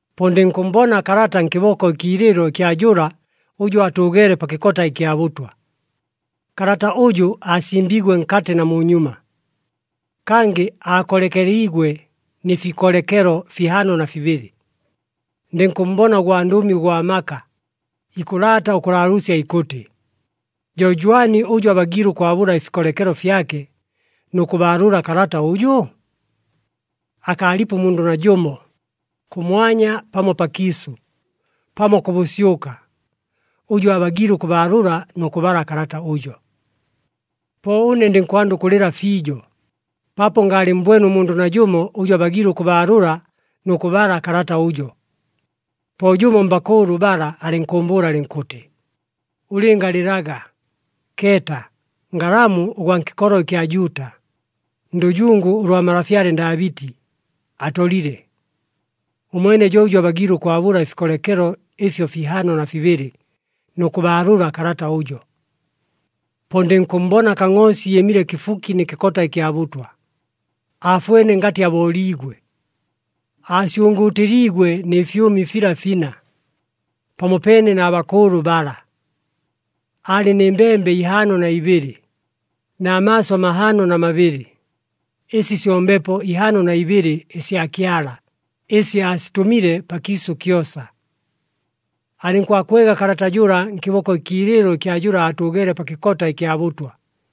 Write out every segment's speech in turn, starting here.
Po ndɨnkʉmmbona kalata nkɨboko ɨkiilɨɨlo ɨkya jʉla ʉjʉ aatʉʉgeele pa kɨkota ɨkya bʉtwa. Kalata ʉjʉ aasimbiigwe nkatɨ na munyuma. Kangɨ aakolekeliigwe nɨ fikolekelo fihaano na fibɨlɨ. Ndɨnkʉmmbona ʉgwandʉmi ʉgwa maka, ikʉlaata ʉkʉlaalʉʉsya ikʉtɨ, “Jo jwani ʉjʉ abagiile ʉkwabʉla ɨfikolekelo fyake nʉ kʉbaalʉla kalata ʉjʉ?” Akaalipo ʉmundʉ najʉmo, kʉmwanya pamo pakiisʉ pamo kʉ bʉsyʉka, ʉjʉ aabagiile ʉkʉbaalʉla nʉ kʉbala kalata ʉjo. Po ʉne ndɨnkwanda ʉkʉlɨla fiijo, paapo ngaalɨmmbwene ʉmundʉ najʉmo ʉjʉ abagiile ʉkʉbaalʉla nʉ kʉbala kalata ʉjo. Po jʉmo mbakʉʉlʉ bala alɨnkʉʉmbʉʉla alɨnkʉtɨ, “Ʉlɨngalɨlaga! Keeta, Ngalamu ʉgwa nkɨkolo ɨkya Juuta, ndʉjungu ʉlwa malafyale Ndaabɨti, atolile. Ʉmwene jo ʉjʉ abagiile ʉkwabʉla ɨfikolekelo ɨfyo fihaano na fibɨlɨ, nʉ kʉbaalʉla kalata ʉjo.” Po ndɨnkʉmmbona Kangʼoosi ɨɨmile kɨfuki nɨ kɨkota kya bʉtwa, aafwene ngatɨ abooliigwe. Aasyʉngʉʉtɨliigwe nɨ fyʉmi fila fina, pamopeene na bakʉʉlʉ bala. Aalɨ nɨ mbembe ihaano na ibɨlɨ, na maaso mahaano na mabɨlɨ, ɨsi syo Mbepo ihaano na ibɨlɨ ɨsya Kyala, ɨsi aasitʉmile pakiisʉ kyosa. Alɨnkwakwega kalata jʉla nkɨboko ɨkiilɨɨlo ɨkya jʉla aatʉʉgeele pa kɨkota ɨkya bʉtwa.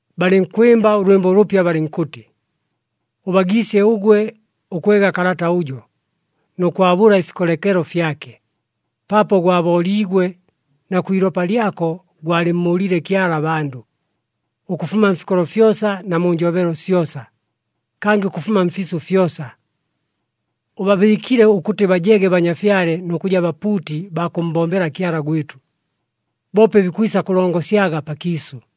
Balɨnkwɨmba ʉlwɨmbo ʉlʉpya balɨnkʉtɨ, “Ʉbagiisye ʉgwe ʉkwega kalata ʉjo, nʉ kwabʉla ɨfikolekelo fyake, paapo gwabooliigwe, na kwi ilopa lyako gwalɨmmʉʉliile Kyala abandʉ, ʉkʉfuma mfikolo fyosa na mu njobelo syosa, kangɨ ʉkʉfuma mfiisʉ fyosa. Ʉbabɨɨkile ʉkʉtɨ bajege banyafyale nʉ kʉja bapuuti baa kʉmmbombela Kyala gwɨtʉ, boope bikwisa kʉlongosyaga pakiisʉ.”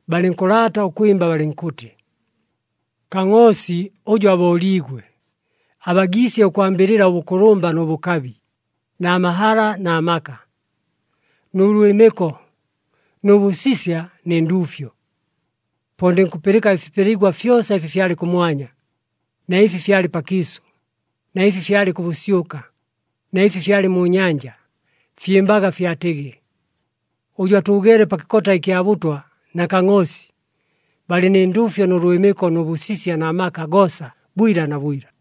Balɨnkʉlaata ʉkwɨmba balɨnkʉtɨ, “Kangʼoosi ʉjʉ abooliigwe, abagiisye ʉkwambɨlɨla ʉbʉkʉlʉmba nʉ bʉkabi, na mahala na maka, nʉ lwɨmɨko nʉ bʉsisya nɨ nduufyo!” Po ndɨnkʉpɨlɨka ɨfipeligwa fyosa ɨfi fyalɨ kʉmwanya, na ɨfi fyalɨ pakiisʉ, na ɨfi fyalɨ kʉ bʉsyʉka, na ɨfi fyalɨ mu nyanja. Fyɨmbaga fyatɨgɨ, “Ʉjʉ atʉʉgeele pa kɨkota ɨkya bʉtwa, na Kangʼoosi, balɨ nɨ nduufyo nʉ lwɨmɨko nʉ bʉsisya na maka goosa bwila na bwila.”